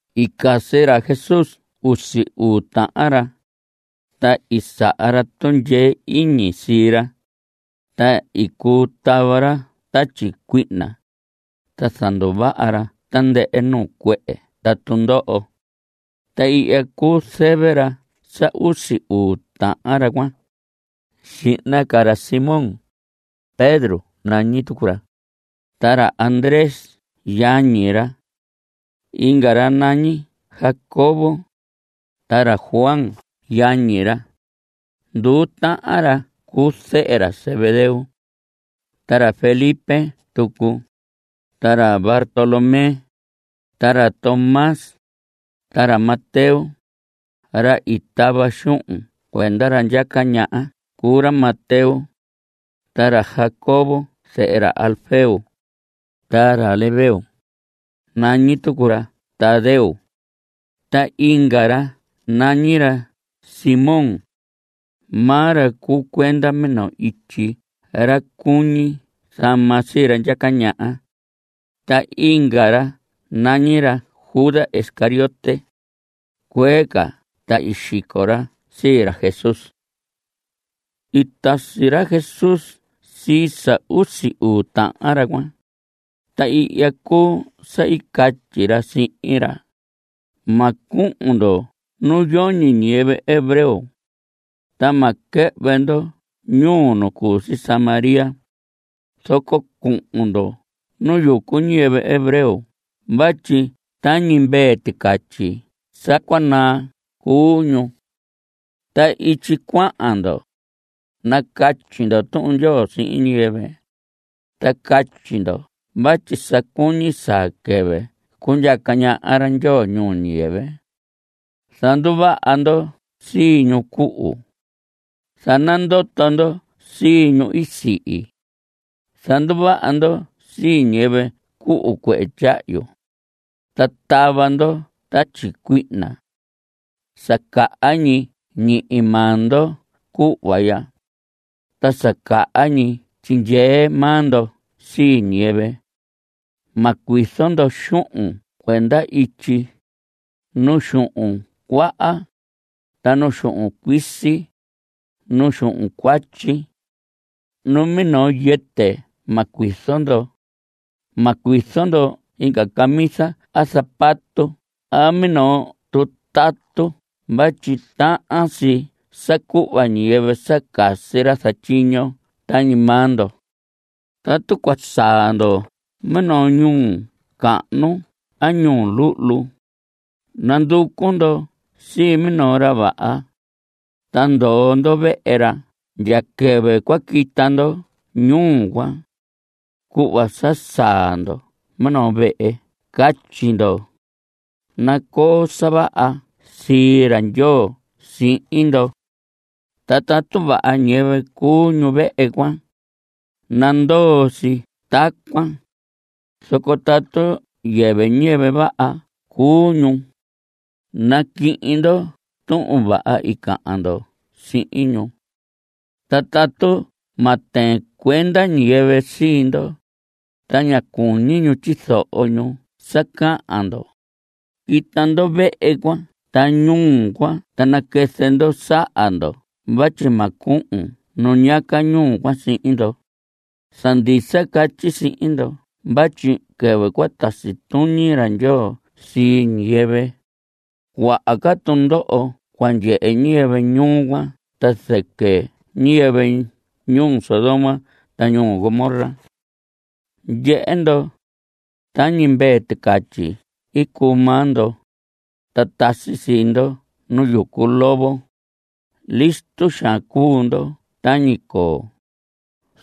I casi ra Jesús usi uu tahan ra. Ta i saha ra tundyee iñi sii ra, ta i cuu tava ra tatyi cuihna, ta zanduvaha ra tandɨhɨ nuu cuehe ta tundoho. Ta ihya cuu zɨvɨ sa usi uu tahan ra cuan. Xihna ca ra Simón. Pedro nañi tucu ra, ta ra Andrés yañi ra. Inga ra nañi Jacobo, ta ra Juan yañi ra. Nduu tahan ra cuu zehe ra Zebedeo. Ta ra Felipe tucu, ta ra Bartolomé, ta ra Tomás, ta ra Mateo; ra i tava xuhun cuenda ra ndyaca ñaha cuu ra Mateo. Ta ra Jacobo zehe ra Alfeo, ta ra Lebeo. Nañi tucu ra Tadeo. Ta inga ra nañi ra Simón. Maa ra cuu cuenda minoo ityi ra cuñi zama sii ra ndyaca ñaha. Ta inga ra nañi ra Judas Iscariote. Cuee ca ta i xico ra sii ra Jesús. I tasi ra Jesús sii sa usi uu tahan ra cuan, ta ihya cuu sa i catyi ra sihin ra: Ma cuhun ndo nu yoñi ñiyɨvɨ hebreo, ta ma quɨhvɨ ndo ñuu nu cu si Samaria. Zoco cuhun ndo nu yucu ñiyɨvɨ hebreo vatyi tañi mvee ticatyi sa cua naa cuu ñu. Ta ityi cuahan ndo, nacatyi ndo Tuhun Ndyoo sihin ñiyɨvɨ, ta catyi ndo vatyi sa cuñi saa quɨvɨ cundyaca ñaha ra Ndyoo ñuu ñiyɨvɨ. Zanduvaha ndo sii ñu cuhu. Zanandoto ndo sii ñu i sihi. Zanduvaha ndo sii ñiyɨvɨ cuhu cuehe tyahyu, ta tava ndo tatyi cuihna. Sa caha ñi ñihi maa ndo cuhva ya, ta sa caha ñi tyindyee maa ndo sii ñiyɨvɨ. Ma cuizo ndo xuhun cuenda ityi, nu xuhun cuaan, ta nu xuhun cuisi, ta nu xuhun cuatyi. Numinoo yɨtɨ ma cuizo ndo. Ma cuizo ndo inga camisa a zapato a minoo tutatu vatyi tahan si sa cuhva ñiyɨvɨ sa casi ra zatyiño tañi maa ndo. Tatu cua saa ndo minoo ñuu cahnu a ñuu luhlu, nanducu ndo sii minoo ra vaha, ta ndoo ndo vehe ra ndya quɨvɨ cua quita ndo ñuu cuan. Cuhva sa saa ndo minoo vehe catyi ndo: “Nacoo sa vaha sii ra Ndyoo sihin ndo.” Ta tatu vaha ñiyɨvɨ cuu ñu vehe cuan, nandoo si tacuan, zoco tatu yɨvɨ ñiyɨvɨ vaha cuu ñu, naquihin ndo tuhun vaha i cahan ndo sihin ñu. Ta tatu ma tɨɨn cuenda ñiyɨvɨ sii ndo, ta ña cuñi ñu tyizoho ñu sa cahan ndo, quita ndo vehe cuan ta ñuu cuan ta naquɨzɨ ndo saha ndo vatyi ma cuhun nu ñiyaca ñuu cuan sihin ndo. Sa ndisa catyi sihin ndo vatyi quɨvɨ cua tasi tuñi ra Ndyoo sii ñiyɨvɨ, cuaha ca tundoho cua ndyehe ñiyɨvɨ ñuu cuan ta zɨquɨ niyɨvɨ ñuu Sodoma ta ñuu Gomorra. Ndyehe ndo, tañi mvee ticatyi cuu maa ndo, ta tasi sii ndo nu yucu lobo. Listo xaan cuu ndo tañi coo,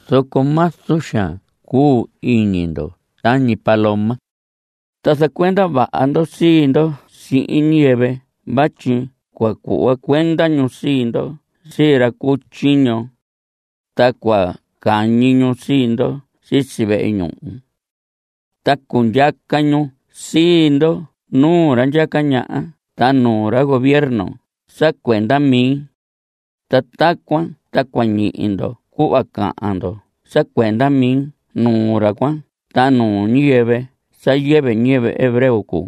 zoco mazu xaan cuu iñi ndo tañi paloma. Ta zacuenda vaha ndo sii ndo sihin ñiyɨvɨ vatyi cua cuhva cuenda ñu sii ndo sii ra cu tyiño. Ta cua cañi ñu sii ndo sisi vehe ñuhu. Ta cundyaca ñu sii ndo nuu ra ndyaca ñaha ta nuu ra gobierno sa cuenda mi. Ta tacuan ta cua ñihi ndo cuhva cahan ndo sa cuenda mi nuu ra cuan ta nuu ñiyɨvɨ sa yɨvɨ ñiyɨvɨ hebreo cuu.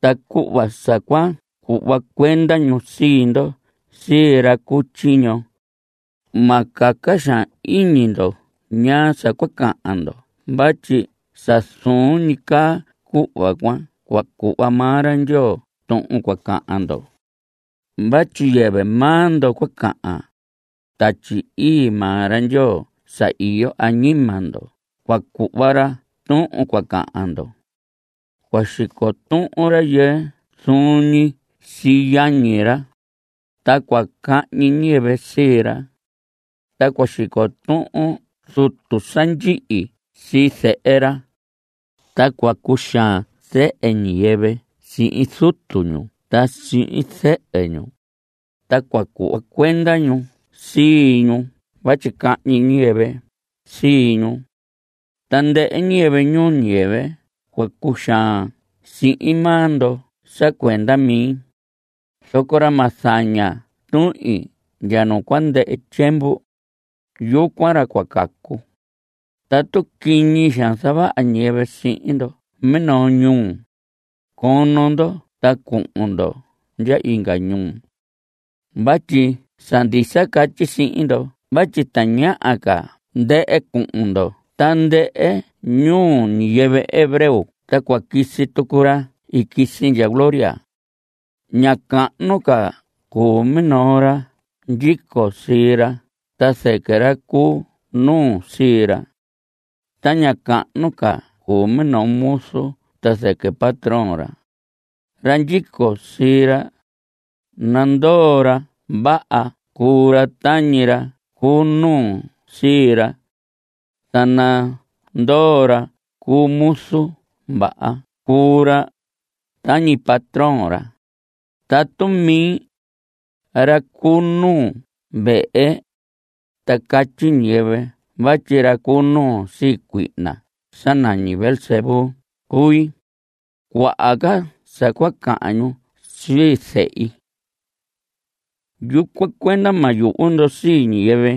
Ta cuhva sa cua cuhva cuenda ñu sii ndo sii ra cu tyiño, ma caca xaan iñi ndo ñaa sa cua cahan ndo vatyi sa zuun ñi caa cuhva cuan cua cuhva maa ra Ndyoo tuhun cua cahan ndo. Vatyi yɨvɨ maa ndo cua cahan. Tatyi Ii maa ra Ndyoo sa iyo añima ndo cua cuhva ra tuhun cua cahan ndo. Cua xico tuhun rayɨɨ zuun ñi sii yañi ra, ta cua cahñi ñiyɨvɨ sii ra. Ta cua xico tuhun zutu sa ndyihi sii zehe ra. Ta cua cuxaan zehe ñiyɨvɨ sihin zutu ñu ta sihin zɨhɨ ñu, ta cua cuhva cuenda ñu sii ñu vatyi cahñi niyɨvɨ sii ñu. Tandɨhɨ ñiyɨvɨ ñuu ñiyɨvɨ cua cuxaan sihin maa ndo sa cuenda mi, zoco ra ma zaña tuhin ndya nu cua ndɨhɨ tyiemvu, yucuan ra cua cacu. Tatu quiñi xaan zavaha ñiyɨvɨ sihin ndo minoo ñuu, cono ndo ta cuhun ndo ndya inga ñuu. Vatyi sa ndisa catyi sihin ndo vatyi tañaha ca ndɨhɨ cuhun ndo tandɨhɨ ñuu ñiyɨvɨ hebreo ta cua quisi tucu ra i quisi ndya gloria. Ña cahnu ca cuu minoo ra ndyico sii ra ta zɨquɨ ra cu nuu sii ra. Ta ña cahnu ca cuu minoo muzu ta zɨquɨ patrón ra. Ra ndyico sii ra, nandoo ra vaha cuu ra tañi ra cu nuu sii ra. Ta nandoo ra cu muzu vaha cuu ra tañi patrón ra. Tatu mi, ra cu nuu vehe, ta catyi ñiyɨvɨ vatyi ra cu nuu sii cuihna sa nañi Beelzebú cui, cuaha ca sa cua cahan ñu sii zehi. Yucuan cuenda ma yuhu ndo sii ñiyɨvɨ.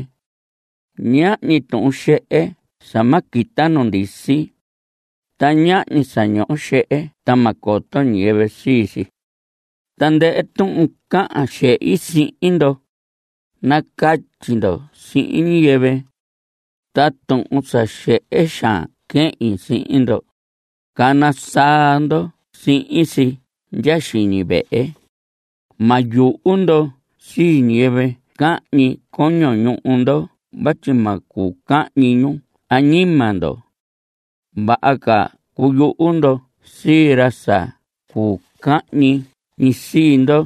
Ñahñi tuhun xehe sa ma quita nu ndisi. Ta ñahñi sa ñoho xehe ta ma coto ñiyɨvɨ sii si. Tandɨhɨ tuhun cahan xehi sihin ndo, nacatyi ndo sihin ñiyɨvɨ. Ta tuhun sa xehe xaan quehin sihin ndo, cana saa ndo sii si ndya xiñi vehe. Ma yuhu ndo sii ñiyɨvɨ cahñi coño ñuhu ndo vatyi ma cuu cahñi ñu añima ndo. Vaha ca cuyuhu ndo sii ra sa cuu cahñi sii ndo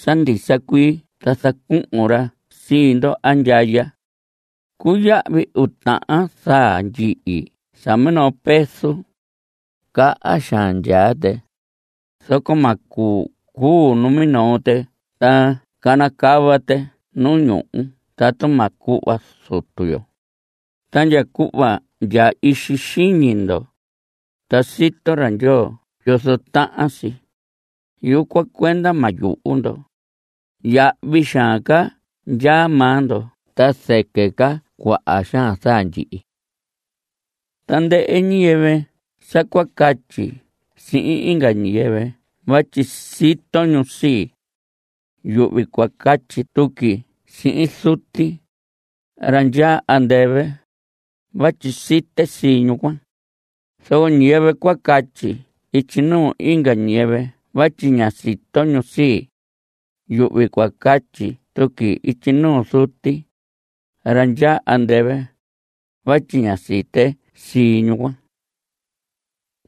sa ndisa cuii ta zacuhun ra sii ndo andyaya. Cuyahvi uu tahan zaa ndyihi sa minoo peso. Caha xaan ndyaa tɨ, zoco ma cuu cuu numinoo tɨ ta canacava tɨ nu ñuhu tatu ma cuhva Zutu yo. Ta ndya cuhva ndya ixi xiñi ndo, ta sito ra Ndyoo yozo tahan si. Yucuan cuenda ma yuhu ndo. Yahvi xaan ca ndyaa maa ndo ta zɨquɨ ca cuaha xaan zaa ndyihi. Tandɨhɨ ñiyɨvɨ sa cua catyi sihin inga ñiyɨvɨ vatyi sito ñu sii, yuhvi cua catyi tuqui sihin Zuti, ra ndyaa andɨvɨ, vatyi site sii ñu cuan. Zoco ñiyɨvɨ cua catyi ityi nuu inga ñiyɨvɨ vatyi ña sito ñu sii, yuhvi cua catyi tuqui ityi nuu Zuti, ra ndyaa andɨvɨ, vatyi ña site sii ñu cuan.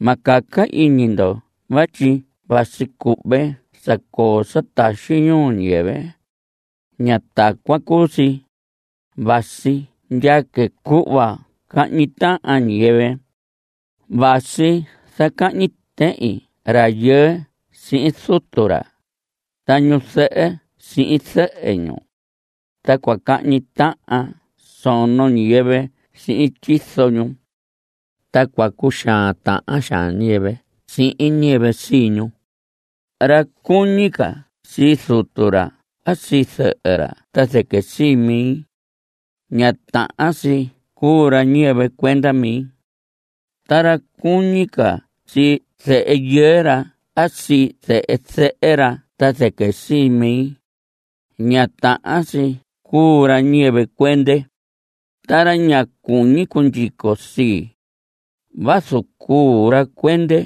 Ma caca iñi ndo vatyi vasi cuhve sa coo sa taxi ñuu ñiyɨvɨ. Ña tacuan cuu si. Vasi ndyaque cuhva cahñi tahan ñiyɨvɨ. Vasi zacahñi tehin rayɨɨ sihin zutu ra ta ñu zɨhɨ sihin zɨhɨ ñu. Ta cua cahñi tahan sono ñiyɨvɨ sihin tyizo ñu. Ta cua cuxaan tahan xaan ñiyɨvɨ sihin ñiyɨvɨ sii ñu. Ra cuñi ca sii zutu ra a sii zɨhɨ ra ta zɨquɨ sii mi, ña tahan si cuu ra ñiyɨvɨ cuenda mi. Ta ra cuñi ca sii zehe yɨɨ ra a sii zehe zɨhɨ ra ta zɨquɨ sii mi, ña tahan si cuu ra ñiyɨvɨ cuende. Ta ra ña cuñi cundyico sii, vazu cuu ra cuende,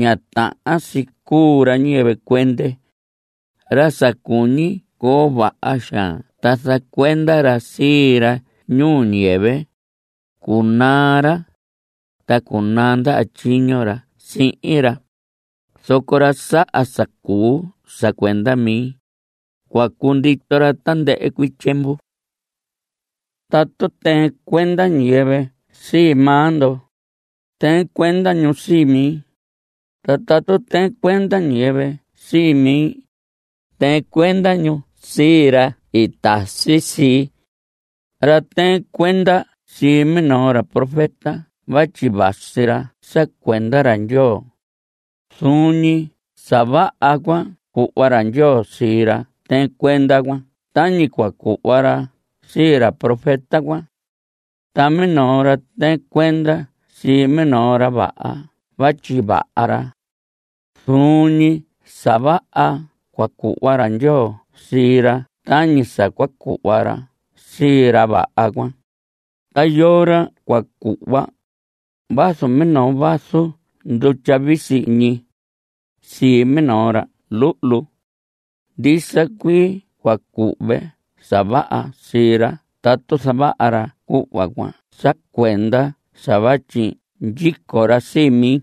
ña tahan si cuu ra ñiyɨvɨ cuende. Ra sa cuñi coo vaha xaan ta zacuenda ra sii ra ñuu ñiyɨvɨ, cunaa ra, ta cunaa ndaha tyiño ra sihin ra. Zoco ra saha sa cuu sa cuenda mi, cua cundito ra tandɨhɨ cuii tyiemvu. Tatu tɨɨn cuenda ñiyɨvɨ sii maa ndo, tɨɨn cuenda ñu sii mi. Ta tatu tɨɨn cuenda ñiyɨvɨ sii mi, tɨɨn cuenda ñu sii ra i tasi sii. Ra tɨɨn cuenda sii minoo ra profeta vatyi vasi ra sa cuenda ra Ndyoo, zuun ñi sa vaha cua cuhva ra Ndyoo sii ra tɨɨn cuenda cuan tañi cua cuhva ra sii ra profeta cuan. Ta minoo ra tɨɨn cuenda sii minoo ra vaha vatyi vaha ra, zuun ñi sa vaha cua cuhva ra Ndyoo sii ra tañi sa cua cuhva ra sii ra vaha cuan. Ta yoo ra cua cuhva, vazu minoo vaso ndutya visi ñi, sii minoo ra luhlu. Ndisa cuii cua cuhve sa vaha sii ra tatu zavaha ra cuhva cuan sa cuenda sa vatyi ndyico ra sii mi.